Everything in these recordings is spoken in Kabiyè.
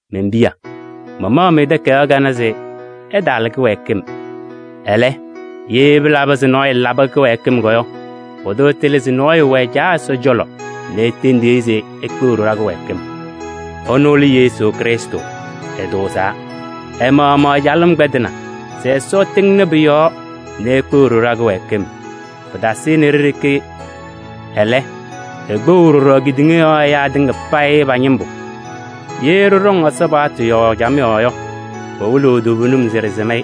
Men-piya! Mamaɣ-mɩ takayaɣ kanɛ se ɩtaala kɩwɛɛkɩm. Ɛlɛ, ye pɩlabɩ se nɔɔyʋ labɩ kɩwɛɛkɩm yɔ, pʋdʋ ɛtɩlɩ se nɔɔyʋ wɛ Caa Ɛsɔ cɔlɔ nɛ etendiɣ-i se ekpeɣ-ɖʋ ɖa-kɩwɛɛkɩm. Ɛnʋ lɛ Yesu Krɩstʋ, ɛtʋʋzaa. Ɛ-maɣmaɣ ɛ-calɩm kpɛdɩnɩ se Ɛsɔ ɛtɩŋnɩ pʋ-yɔɔ nɛ ekpeɣ-ɖʋ ɖa-kɩwɛɛkɩm. Pɩtaasɩnɩ ɖe-ɖeke, ɛlɛ, ekpeɣ ɖɔɖɔ kedeŋa yɔɔ ɛyaa tɩŋa payɩ pa-ñɩmbʋ. Ye ɖɩɖɔŋ Ɛsɔ paɣtʋ yɔɔ camɩyɛ yɔ, pɩwɩlɩɣ toovenim se ɖɩsɩm-ɩ.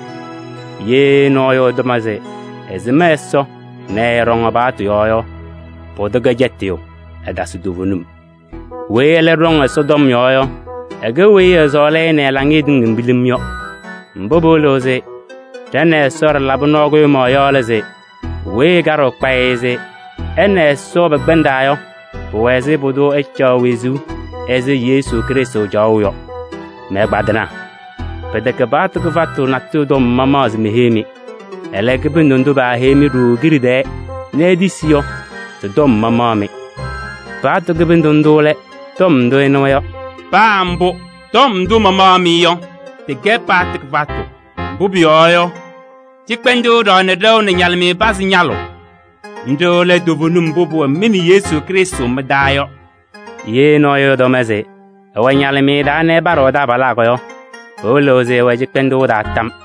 Ye nɔɔyʋ ɛtɔm se ɛsɩm Ɛsɔ nɛ ɛɛɖɔŋ ɛ-paɣtʋ yɔɔ yɔ, pʋdʋ kɛ cɛtɩyʋ, ɛtasɩ toovenim. Weyi ɛlɛ ɖɔŋ Ɛsɔ tɔm yɔɔ yɔ, ɛkɛ weyi ɛsɔɔlɩ-ɩ nɛ ɛ-laŋɩyɛ tɩŋa pilim yɔ. Mbʋ pɩwɩlɩɣ se ɖa nɛ Ɛsɔ ɖɩlabɩ nɔɔ kʋɖʋmaɣ yɔ lɛ se: weyi ɛkaɖɩɣ kpayɩ se ɛ nɛ Ɛsɔ pɛkpɛndaa yɔ, pʋwɛɛ se pʋdʋ ɛcaɣ wezuu ɛzɩ Yesu Krɩstʋ caɣʋ yɔ. Mɛ-ɛgbaadɩnaa! Pɩtɛkɛ paɣtʋ kɩfatʋ natʋyʋ tɔm mamaɣ se meheyi-mɩ. Ɛlɛ, kɩbɩndʋ ndʋ peheyi-mɩ ɖooo kiɖe tɛɛ nɛ itisi yɔ, tɩ-tɔm mamaɣ-mɩ. Paɣtʋ kɩbɩndʋ ndʋ lɛ tɔm ndʋ ɩnɩwa yɔ. Paa mbʋ, tɔm ndʋ mamaɣ-mɩ yɔ, tɩkɛ paɣtʋ kɩfatʋ. Mbʋ pʋyɔɔ yɔ, cɩkpɛndʋʋ ɖɔŋnɩ ɖɛʋ nɛ ñalɩmɩyɛ ñapazɩ ñalʋʋ: nɖɩ lɛ toovenim mbʋ pʋwɛ mɩ nɛ Yesu Krɩstʋ mɩ-taa yɔ. Ye nɔɔyʋ ɛtɔm se ɛwɛ ñalɩmɩyɛ taa nɛ ɛpaɖɩɣ ɛ-taabalaa yɔ, pɩwɩlɩɣ se ɛwɛ cɩkpɛndʋʋ taa tam.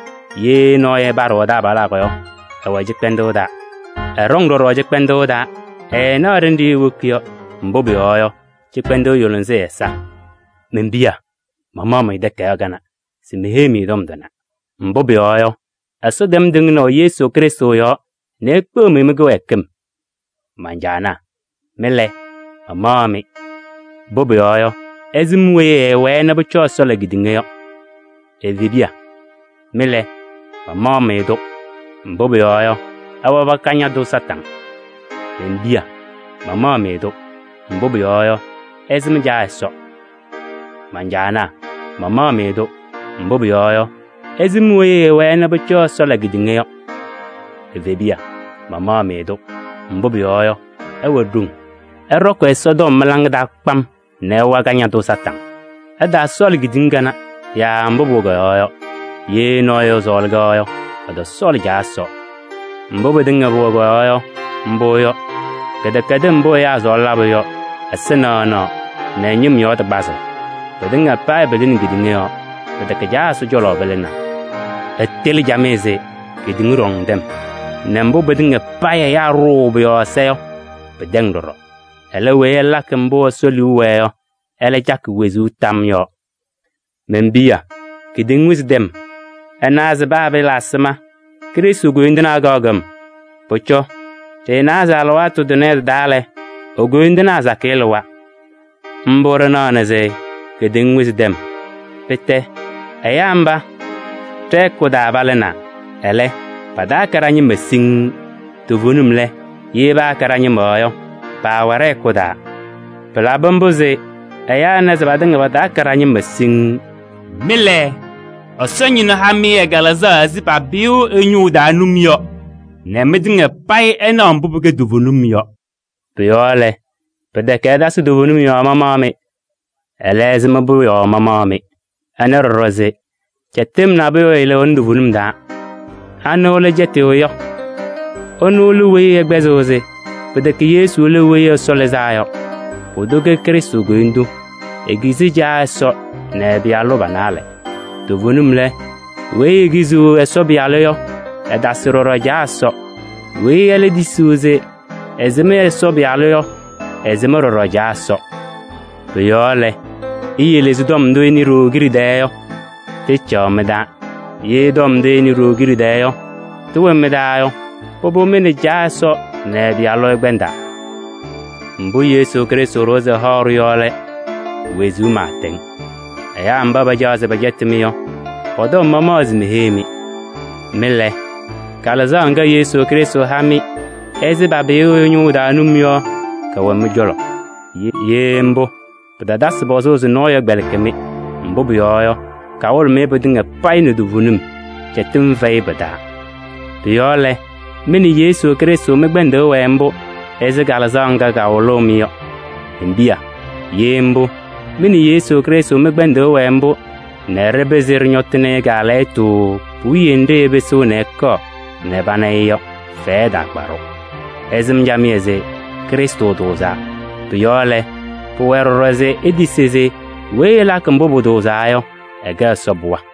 Ye nɔɔyʋ ɛpaɖɩɣ ɛ-taabalaa yɔ, ɛwɛ cɩkpɛndʋʋ taa. Ɛɖɔŋ ɖɔɖɔ cɩkpɛndʋʋ taa, ɛɛnaɣ ɖenɖe ewoki yɔ, mbʋ pʋyɔɔ yɔ, cɩkpɛndʋʋ yʋlɩsɩ ɛ-ɛza. Men-piya! Mamaɣ-mɩ takayaɣ kanɛ se meheyi-mɩ tɔm tʋnɛ, mbʋ pʋyɔɔ yɔ, Ɛsɔ tɛm tɩŋnaʋ Yesu Krɩstʋ yɔɔ nɛ ekpeɣ-mɩ mɩ-kɩwɛɛkɩm. Man-caanaa! Mɩ lɛ, mamaɣ-mɩ, mbʋ pʋyɔɔ yɔ, ɩsɩm weyi ɛɛwɛɛ nɛ pʋcɔ Ɛsɔ la kedeŋa yɔ. Evebiya! Mɩ lɛ, mamaɣ-mɩ-tʋ, mbʋ pʋyɔɔ yɔ, ɩwabɩ Kañadʋ Satanɩ. Men-piya! Mama-mɩ-tʋ, mbʋ pʋyɔɔ yɔ, ɩsɩm Caa Ɛsɔ. Man-caanaa! Mama-mɩ-tʋ, mbʋ pʋyɔɔ yɔ, ɩsɩm weyi ɛɛwɛɛ nɛ pʋcɔ Ɛsɔ la kedeŋa yɔ. Evebiya! Mama-mɩ-tʋ, mbʋ pʋyɔɔ yɔ, ɩwɛ ɖoŋ. Ɩɖɔkɩ Ɛsɔtɔm mɩ-laŋa taa kpam nɛ ɩwa Kañadʋ Satanɩ. Ɩtaasɔɔlɩ kedeŋa kanɛ yaa mbʋ pʋwɛ kɔ-yɔɔ yɔ. Ye nɔɔyʋ ɛsɔɔlɩ-kɛ yɔ, ɛtɔsɔɔlɩ Caa Ɛsɔ. Mbʋ pɩtɩŋa pʋwɛ kɔ-yɔɔ yɔ, mbʋ yɔ: kɩdɛkɛdɩm mbʋ ɛyaa sɔɔlɩ labʋ yɔ, ɛza naɣnaɣ nɛ ñɩm yɔɔ tɩ kpazʋʋ. Pɩtɩŋa payɩ pɩlɩnɩ kedeŋa yɔɔ, pɩtɛkɛ Caa Ɛsɔ cɔlɔ pɩlɩnaa. Ɩtɩlɩ camɩyɛ se kedeŋa ɖɔŋ tɛm nɛ mbʋ pɩtɩŋa payɩ ɛyaa ɖʋʋ pʋ-yɔɔ ɛza yɔ, pɩtɛŋ ɖɔɖɔ. Ɛlɛ, weyi ɛlakɩ mbʋ Ɛsɔ liu wɛɛ yɔ, ɛlɛ cakɩ wezuu tam yɔɔ. Men-piya! Kedeŋa wɩzɩ tɛm! Ɩnɩwa se paa pɩɩla ɛzɩma Krɩstʋ koyindu kaɣ kɔm. Pʋcɔ ɖɩnawa se alɩwaatʋ tʋnɛ tɩ-taa lɛ, e-koyindinaa sakɩyɛ lɩwa. Mbʋ ɖɩnanaa se kedeŋa wɩzɩ tɛm. Pɩtɛ ɛyaa mba, ɖɛ-hɛkʋ taa palɩnaa, ɛlɛ, pataakɛ ɖa-ñɩma siŋŋ. Toovenim lɛ, ye paakɛ ɖa-ñɩma yɔ, paawɛ ɖɛ-hɛkʋ taa. Pɩlabɩ mbʋ se ɛyaa ɛna se patɩŋa pataakɛ ɖa-ñɩma siŋŋ. Mɩ lɛ, Ɛsɔ Ñɩnʋ ha-mɩ ɛ-Kalɩzaɣ ɛzɩ papɩyʋʋ ɛyʋ ñʋʋ taa num yɔ nɛ mɩtɩŋa payɩ ɩnaɣ mbʋ pɩkɛ toovenim yɔ. Pʋ-yɔɔ lɛ, pɩtɛkɛ se ɩtasɩ toovenim yɔɔ mamaɣ-mɩ. Ɛlɛ, ɩsɩm-pʋ yɔɔ mamaɣ-mɩ. Ɩnawa ɖɔɖɔ se cɛtɩm nabʋyʋ ɛɛlɩɣnɩ toovenim taa. Anɩ lɛ cɛtɩyʋ yɔ? Ɛnʋ lɛ weyi ɛkpɛzɩɣ se pɩtɛkɛ Yesu lɛ Weyi Ɛsɔ Lɩzaa yɔ. Pʋdʋ kɛ Krɩstʋ koyindu: ekizi Caa Ɛsɔ nɛ ɛ-Pɩyalʋ pa-naalɛ. Toovenim lɛ, weyi ekiziɣ Ɛsɔ Pɩyalʋ yɔ, ɛtasɩ ɖɔɖɔ Caa Ɛsɔ. Weyi ɛlɛ tisiɣ se ɛsɩm Ɛsɔ Pɩyalʋ yɔ, ɛsɩm ɖɔɖɔ Caa Ɛsɔ. Pʋ-yɔɔ lɛ, iyele se tɔm ndʋ ɩnɩ ɖooo kiɖe tɛɛ yɔ, tɩcaɣ mɩ-taa. Ye tɔm ndʋ ɩnɩ ɖooo kiɖe tɛɛ yɔ, tɩwɛ mɩ-taa yɔ, pʋbʋ, mɩ nɛ Caa Ɛsɔ nɛ ɛ-Pɩyalʋ ɩkpɛndaa. Mbʋ Yesu Krɩstʋ ɖʋwa se ɛhaɣ-ɖʋ yɔ lɛ: wezuu pɩɩtɛŋ. Ɛyaa mba pacaɣ se pɛcɛtɩ-mɩ yɔ, pɔ-tɔm mamaɣ se meheyi-mɩ. Mɩ lɛ, Kalɩzaɣ ŋga Yesu Krɩstʋ ha-mɩ ɛzɩ papɩyʋʋ ɛyʋ ñʋʋ taa num yɔ, kɛwɛ mɩ-cɔlɔ. Ye mbʋ, pɩtatasɩ pɔzʋʋ se nɔɔyʋ ɛkpɛlɩkɩ-mɩ, mbʋ pʋyɔɔ yɔ, kawɩlɩɣ-mɩ pɩtɩŋa payɩ nɛ toovenim, cɛtɩm fɛyɩ pɩ-taa. Pʋ-yɔɔ lɛ, mɩ nɛ Yesu Krɩstʋ mɩ-kpɛndʋʋ ɛwɛɛ mbʋ ɛzɩ Kalɩzaɣ ŋga kawɩlʋʋ-mɩ yɔ. Men-piya! Ye mbʋ, mɩ nɛ Yesu Krɩstʋ mɩ-kpɛndʋʋ ɛwɛɛ mbʋ nɛ ɖɩpɩzɩ ɖɩñɔtɩnɩ-ɩ kaalɛyɩtʋ puwiye nɖɩ ɛpɩsɩɣ ɛkɔɔ nɛ pana-ɩ yɔ, fɛyɛ ɛtaakpa-ɖʋ. Ɩsɩm camɩyɛ se Krɩstʋ tʋʋzaa. Pʋ-yɔɔ lɛ, pʋwɛɛ ɖɔɖɔ se itisi se weyi ɛlakɩ mbʋ pʋtʋʋzaa yɔ, ɛkɛ Ɛsɔ pɩɣa.